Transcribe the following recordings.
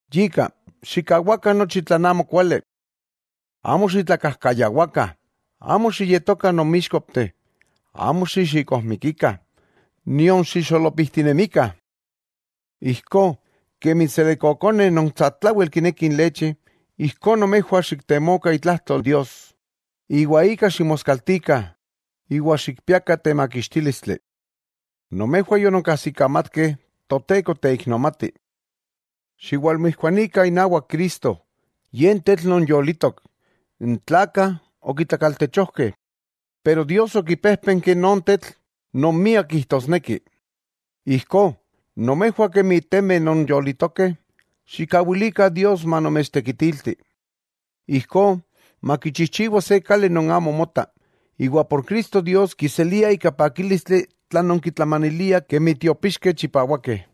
Yika, xikkawakah nochi tlan amo kuali. Amo xitlakajkayawakah, amo xiyetokah nonmixkopteh, amo xixikojmikikah, nion xixolopijtinemikah. Ijkó kemi n selekkokoneh, non satlawel kinekih inlechi, ijkó nomejwah xiktemokah itlajtol Dios, iwa ika ximoskaltikah iwa xikpiakah temakixtílistli. Nomejwah yononkajsikamatkeh Toteko teiknomatih. Xiwalmijkuanikah inawak Cristo, Ye n tetl non yolitok. N tlakah okitlakaltechojkeh, pero Dios okipejpenki non Tetl non miak kijtosneki. Ijkó, nomejwah kemi temeh non yolitokeh, xikkawilikah Dios manomechtekitilti. Ijkó makichijchiwa se kali non amo mota, iwa por Cristo Dios kiselia ika pakílistli tlan nonkitlamaniliah kemi tiopíxkeh chipawakeh.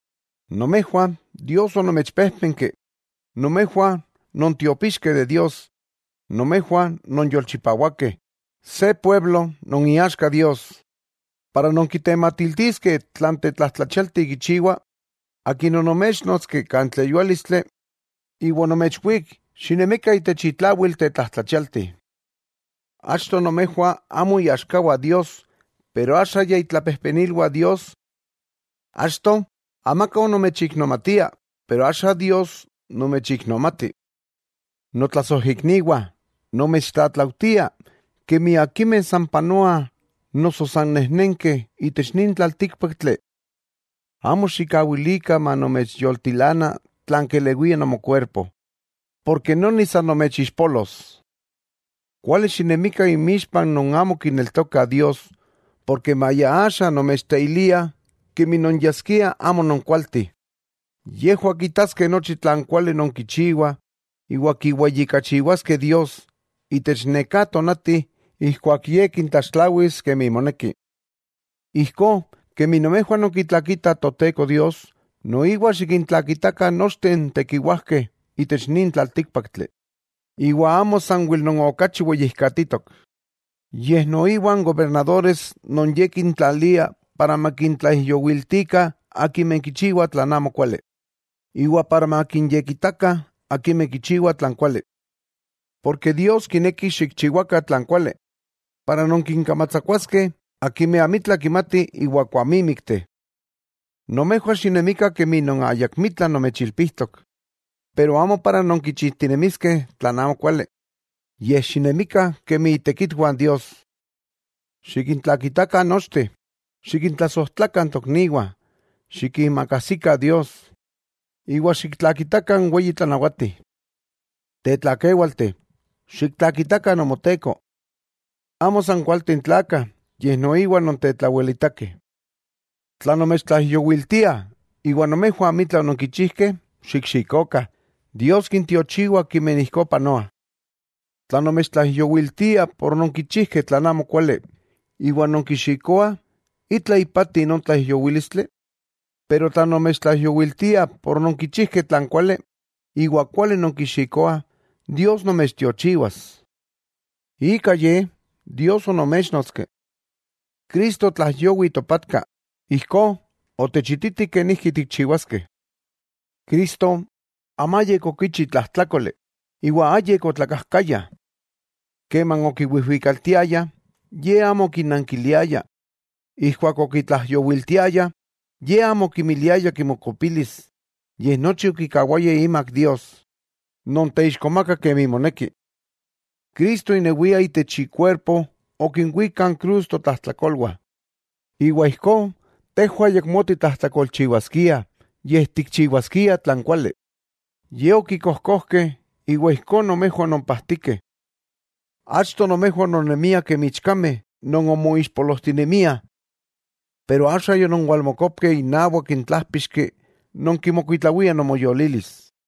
Nomejwah Dios onomechpéjpenki. Nomejwah non tiopixkeh de Dios, nomejwah nonyolchipawakeh, se pueblo non iaxka Dios. Para nonkitematiltiskeh tlan tetlajtlachialti kichiwa, Akin onoméchnotski kan tleyuálistli iwa onomechwík xinemikah itech itlawil tetlajtlachialti. Achto nomejwah amo iaxkawah Dios, pero axa ya itlapejpenilwah Dios, achto amaka onomechiknomatia, pero axa Dios nomechiknomati. Notlasojikniwah, nomechtlatlaujtia, kemi akimeh san panoah noso san nejnenkeh itech nin tlaltíkpaktli, amo xikkawilikah manomechyoltilana tlan kelewia nomokuerpo, porke noni san nomechixpolos. Kuali xinemikah inmixpah non amo kineltokah Dios, porke maya axa nomechteiliah kemi non yaskiah amo nonkualteh, yejwah kitaskeh nochi tlan kuali nonkichiwah iwa kiweyijkachiwaskeh Dios itech neká tonati ijkuak Ye kintlaxtlawis kemi moneki. Ijkó kemi nomejwah nonkitlakitah Toteko Dios, noiwa xikintlakitakah nochteh n tekiwajkeh itech nin tlaltíkpaktli, iwa amo sanwel non okachi weyijkatitok, yej noiwa n gobernadores non ye kintlalia para makintlaijyowiltikah akimeh kichiwah tlan amokuali, iwa para makinyekitakah akimeh kichiwah tlan kuali. Porke Dios kineki xikchiwakah tlan kuali, para nonkinkamatsakuaskeh akimeh amitla kimatih iwa kuamímikteh. Nomejwah xinemikah kemi non ayakmitla nomechilpijtok, pero amo para nonkichijtinemiskeh tlan amokuali, yej xinemikah kemi itekitwah Dios. Xikintlakitakah nochteh, xikintlasojtlakah n tokniwah, xikiimakajsikah Dios, iwa xiktlakitakah n weyi tlanawati. Tetlakéwalteh, xiktlakitakah nomoteko. Amo san akimeh kualteh n tlakah, yej noiwa non tetlawelitakeh. Tla nomechtlaijyowiltiah iwa nomejwah amitla ononkichijkeh xikxikokah, Dios kintiochiwa akimeh ijkó panoah. Tla nomechtlaijyowiltiah por ononkichijkeh tlan amokuali, iwa nonkixikoah, ¿itla ipati non tlaijyowílistli? Pero tla nomechtlaijyowiltiah por ononkichijkeh tlan kuali, iwa kuali nonkixikoah, Dios nomechtiochiwas. Ika ye Dios onoméchnotski. Cristo otlaijyowi topatka, ijkó otechititi kenijki tikchiwaskeh. Cristo amayik okichi tlajtlákoli, iwa ayik otlakajkaya. Keman okiwijwikaltiayah, Ye amo okinnankiliaya, ijkuak okitlaijyowiltiayah, Ye amo okimiliaya kimokopilis, yej nochi okikawaya imak Dios, non teixkomaka kemi moneki. Cristo inewia itech ikuerpo okinwík kan krus totlajtlakolwah. Iwa ijkó tejwah ayakmó titlajtlakolchiwaskiah, yej tikchiwaskiah tlan kuali. Ye okikojkojkeh iwa ijkó nomejwah ononpajtikeh. Achto nomejwah ononnemiah kemi ichkameh non omoixpolojtinemiah, pero axa yononwalmokopkeh inawak n tlájpixki non kinmokuitlawia nomoyolilis.